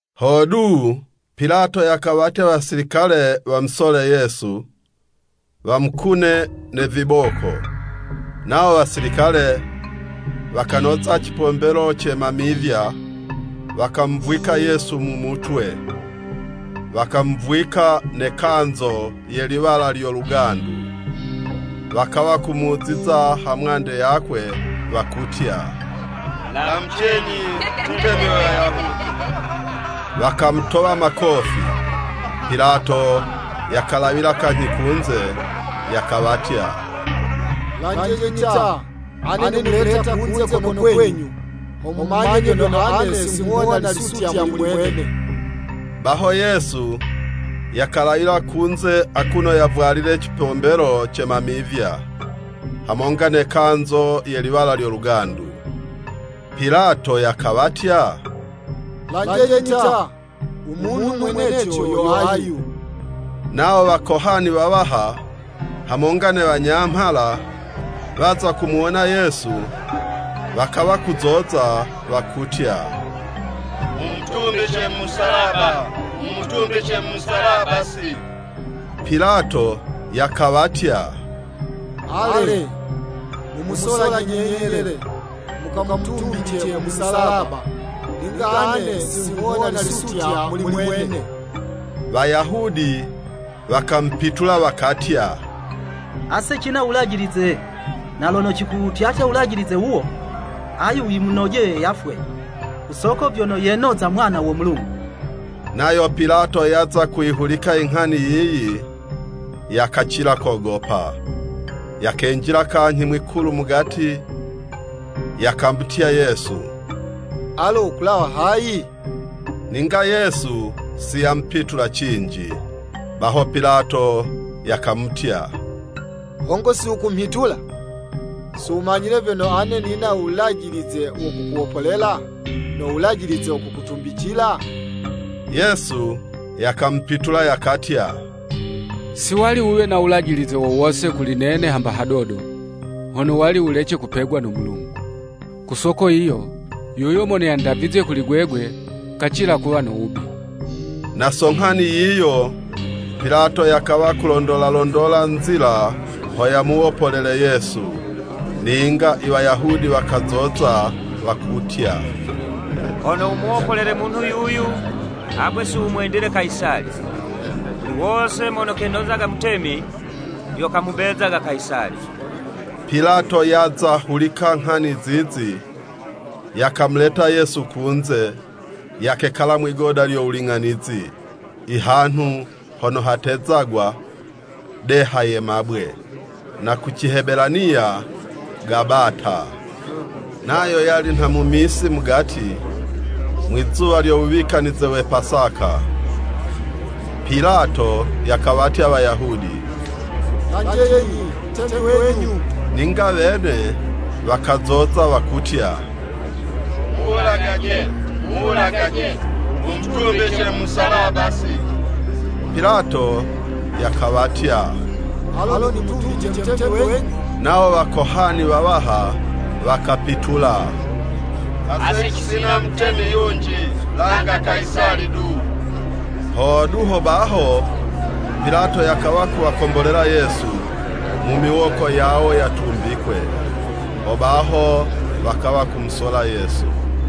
Hodu, Pilato yakawatya Wasilikale wamusole Yesu, wamukune ne viboko. Nawo Wasilikale wakanoza cipombelo ce mamivya, wakamuvwika Yesu mu mutwe, wakamuvwika ne kanzo ye liwala lyo lugandu. Wakawa kumuziza hamwande yakwe, wakutya, “Lamucenyi, Mutemi we Wayahudi! Wakamutowa makofi.” Pilato yakalawila kanyhi kunze, yakawatya, “Lanjenyi ta, ane nimuleta kunze kono kwenyu, ho mumanye vyono ane singhuwona lisutya muli mwene.” Baho Yesu yakalawila kunze akuno yavwalile cipombelo ce mamivya, hamonga ne kanzo ye liwala lyo lugandu. Pilato yakawatya, “Lanjenyi ta! U munhu mweneco yo ayu.” Nawo Wakohani wawaha, hamonga ne wanyamhala waza kumuwona Yesu, wakawa kuzoza, wakutya “Mumutumbice mu Musalaba, Mumutumbice mu Musalaba si.” Pilato yakawatya, “Ale, mumusolaje nyenye le, mukamutumbice mu Musalaba, ninga ane singhuwona lisutya muli mwene.” Wayahudi wakamupitula wakatya, “Ase cina u Wulajilize, na lono cikuwutyatya wulajilize wuwo, ayu yimunojeye yafwe. Ku soko vyono yenoza Mwana wo Mulungu.” Nayo Pilato yaza kuyihulika inghani yiyi, yakacila kogopa. Yakenjila kanyhi mwikulu mugati, yakamutya Yesu “Alo kulawa hayi? Ninga Yesu si yamupitula cinji.” Baho Pilato yakamutya, “Hongo si wukumhitula? Siwumanyile vyono ane nina wulajilize wo kukuwopolela, no wulajilize wo kukutumbicila?” Yesu yakamupitula yakatya, “Si wali wuwe no wulajilize wo wose kuli nene hamba hadodo, hono wali wulece kupegwa no Mulungu. Ku soko yiyo, yuyo mono yandavizye kuli gwegwe, kacila kuwa no wubi.” Na so nghani yiyo, Pilato yakawa kulondola londola nzila ho yamuwopolele Yesu, ninga Iwayahudi wakazoza wakutya, “Hono wumuwopolele munhu yuyu, agwe si wumwendile Kayisali, muli wose mono kenozaga Mutemi, yo kamubezaga Kayisali!” Pilato yaza hulika nghani zizi, yakamuleta Yesu kunze, yakekala mwigoda lyo wuling'anizi, ihanhu hono hatezagwa “Deha ye mabwe,” (na ku Cihebelaniya, “Gabata.”) Nayo yali nha misi mugati, mwizuwa lyo wuwikanize we Pasaka. Pilato yakawatya Wayahudi, “Lanjenyi, Mutemi wenyu!” Ninga wene wakazoza wakutya, “Muwulagaje, Muwulagaje, wumutumbice mu Musalaba si.” Pilato yakawatya, “Alo nimutumbice Mutemi wenyu?” Nawo Wakohani wawaha wakapitula, “Ase cisina mutemi yunji, langa Kayisali du.” Hodu, hobaho Pilato yakawa kuwakombolela Yesu mu miwoko yawo yatumbikwe. Hobaho wakawa kumusola Yesu.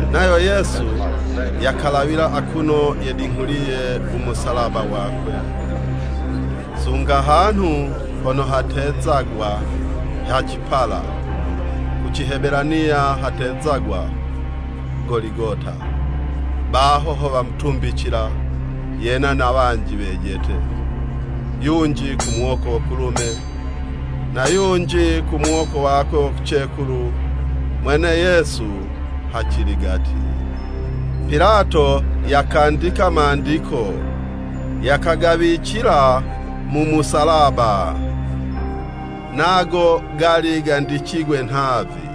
Nayo Yesu yakalawila akuno yedinghuliye u Musalaba wakwe, sunga hanhu hono hatezagwa, “Ha cipala,” (ku Cihebelaniya, hatezagwa, “Goligota.”) Baho ho wamutumbicila yena na wanji wejete, yunji ku muwoko wo kulume, na yunji ku muwoko wo kucekulu, mwene Yesu haciligati. Pilato yakandika mandiko, yakagawicila mu musalaba. Nago gali gandicigwe nhavi,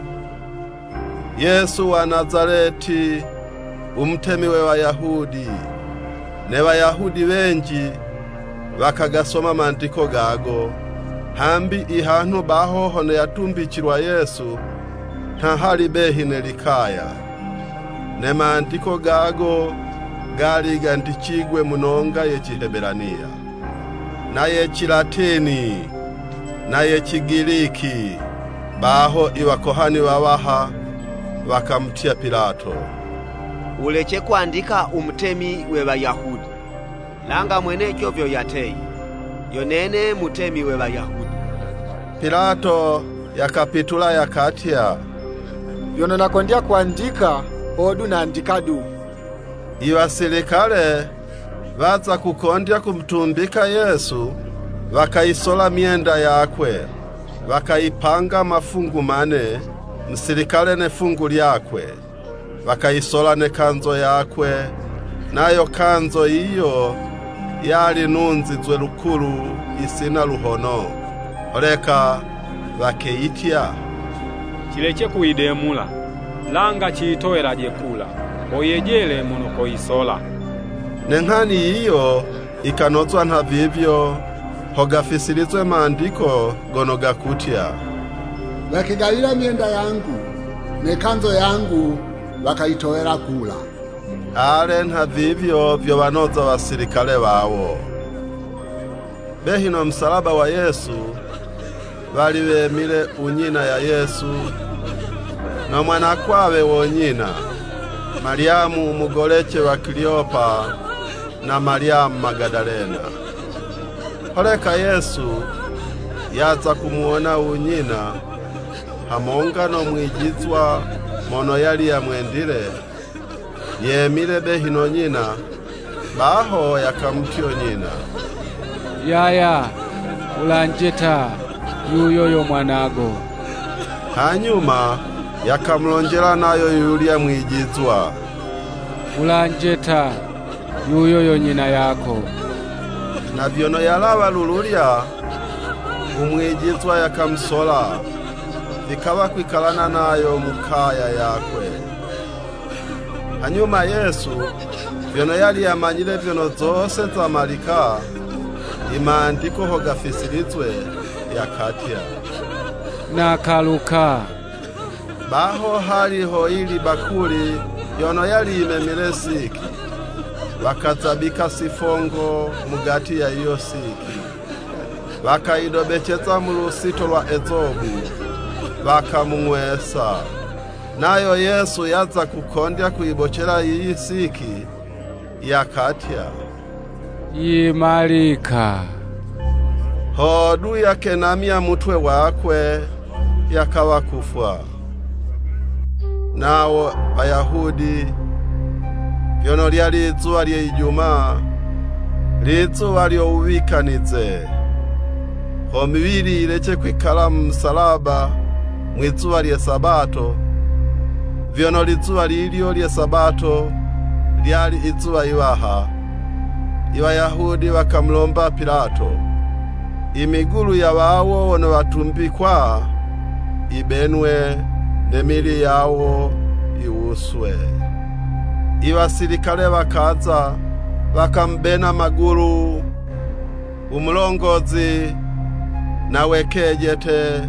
“Yesu wa Nazaleti u Mutemi we Wayahudi.” Ne Wayahudi wenji, wakagasoma Mandiko gago, hambi ihanhu baho hono yatumbicilwa Yesu, nha hali behi ne likaya. Ne mandiko gago gali gandicigwe mu nonga ye Cihebelaniya, na ye Kilatini na ye Cigiliki. Baho iWakohani wawaha wakamutya Pilato, “Wulece kwandika u Mutemi we Wayahudi.” langa mweneco vyono yateye, “Yo nene Mutemi we Wayahudi.” Pilato yakapitula yakatya, “Vyono nakondya kwandika, hodu nandika du.” Iwasilikale, waza kukondya kumutumbika Yesu, wakayisola myenda yakwe, wakayipanga mafungu mane, musilikale ne 'fungu lyakwe. Wakayisola ne kanzo yakwe. Nayo kanzo yiyo, yali nunzizwe lukulu yisina luhono. Holeka wakeyitya, “Cilece kuyidemula, langa ciyitowelaje kula, ho yejele mono koyisola.” Ne nghani yiyo yikanozwa nhavivyo, ho gafisilizwe mandiko gono gakutya, “Wakegawila myenda yangu Ne kanzo yangu wakayitowela kula.” Ale, nhavivyo, vyo wanoza wasilikale wawo. Behi no musalaba wa Yesu, wali wemile u nyina wa Yesu, no mwanakwawe wo nyina, Malyamu u mugolece wa Kileyopa, na Malyamu Magadalena. Holeka Yesu yaza kumuwona u nyina, hamonga no mwijizwa mono yali yamwendile, yemile behi no nyina, baho yakamutya nyina, “Yaya, wulanje ta, yuyo yo Mwanago!” Hanyuma yakamulonjela nayo yuyulya mwijizwa, “Wulanje ta, yuyo yo nyina yako!” Na vyono yalawa lululya, u mwijizwa yakamusola, vikawa kwikalana nayo mu kaya yakwe. Hanyuma Yesu, vyono yali yamanyile vyono zose zamalika, imandiko ho gafisilizwe, yakatya, “Nakaluka.” Baho hali hoyili bakuli yono yali yimemile siki. Wakazabika sifongo mugati ya yiyo siki, wakayidobeceza mu lusito lwa ezobu, wakamung'wesa. Nayo Yesu yaza kukondya kuyibocela yiyo siki, yakatya, “Yimalika” hodu yakenamya mutwe wakwe, yakawa kufwa. Nawo Wayahudi, vyono lyali izuwa lye Ijumaa, lizuwa lyo wuwikanize. Ho miwili yilece kwikala mu musalaba mwi'zuwa lye Sabato, vyono lizuwa lilyo lye Sabato lyali izuwa yiwaha, Iwayahudi wakamulomba Pilato, imigulu ya wawo wono watumbikwa, yibenwe, ne miwili yawo yiwuswe. Iwasilikale wakaza, wakamubena magulu, u mulongozi, na we kejete,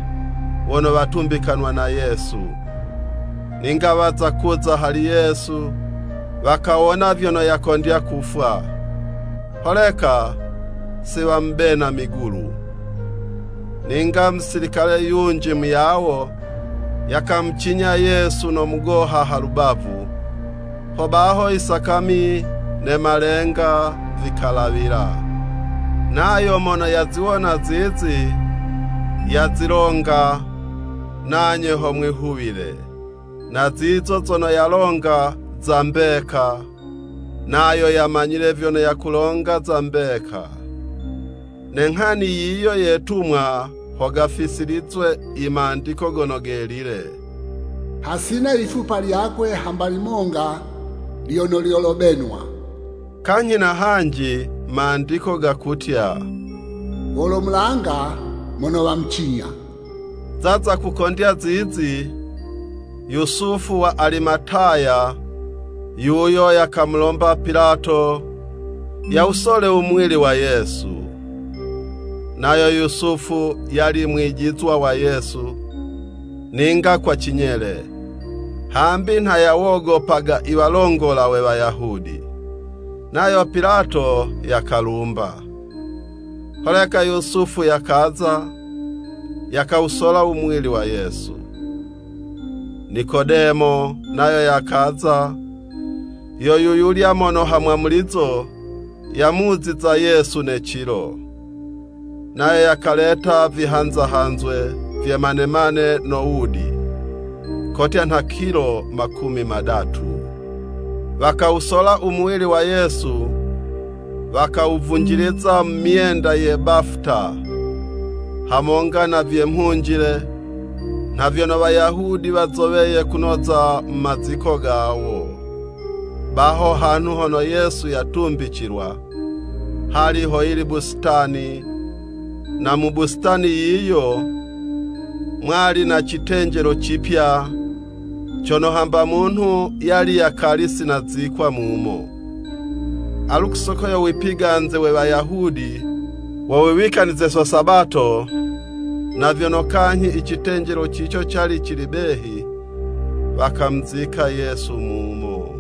wono watumbikanwa na Yesu. Ninga waza kuza hali Yesu, wakawona vyono yakondya kufwa, holeka si wamubena migulu. Ninga musilikale yunji muyawo, yakamucinya Yesu no mugoha ha lubavu, hobaho isakami ne malenga vikalawila. ( Nayo mono yaziwona zizi, yazilonga, nanye ho mwihuwile. Na zizo zono yalonga, za mbeka, nayo yamanyile vyono yakulonga za mbeka.) Ne nghani yiyo yetumwa ho gafisilizwe i Mandiko Gono Gelile. “Hasina yifupa lyakwe hamba limonga lyono lyolobenwa.” Kanyhi na hanji mandiko gakutya, “Wolomulanga mono wamucinya.” Zaza kukondya zizi, Yusufu wa Alimataya, yuyo yakamulomba Pilato, yawusole u muwili wa Yesu. (Nayo Yusufu yali mwijizwa wa Yesu, ninga kwa cinyele, hambi nha yawogopaga i walongola we Wayahudi.) Nayo Pilato yakalumba. Holeka Yusufu yakaza, yakawusola u muwili wa Yesu. Nikodemo nayo yakaza, yo yuyulya mono ha mwamulizo yamuziza Yesu ne cilo. Nayo yakaleta vihanza hanzwe vye manemane na wudi, kotya nha kilo makumi madatu. Wakawusola u muwili wa Yesu, wakawuvunjiliza mu myenda ya bafuta, hamonga na vye mhunjile, nha vyono Wayahudi wazoweye kunoza mu maziko gawo. Baho hanhu hono Yesu yatumbicilwa, hali ho yili busitani, na mu busitani yiyo, mwali na citenjelo cipya, cono hamba munhu yali yakali si nazikwa mumo. Alu, ku soko yo wipiganze we Wayahudi wo wiwikanize so Sabato, na vyono kanyhi icitenjelo cico cali cili behi, wakamuzika Yesu mumo.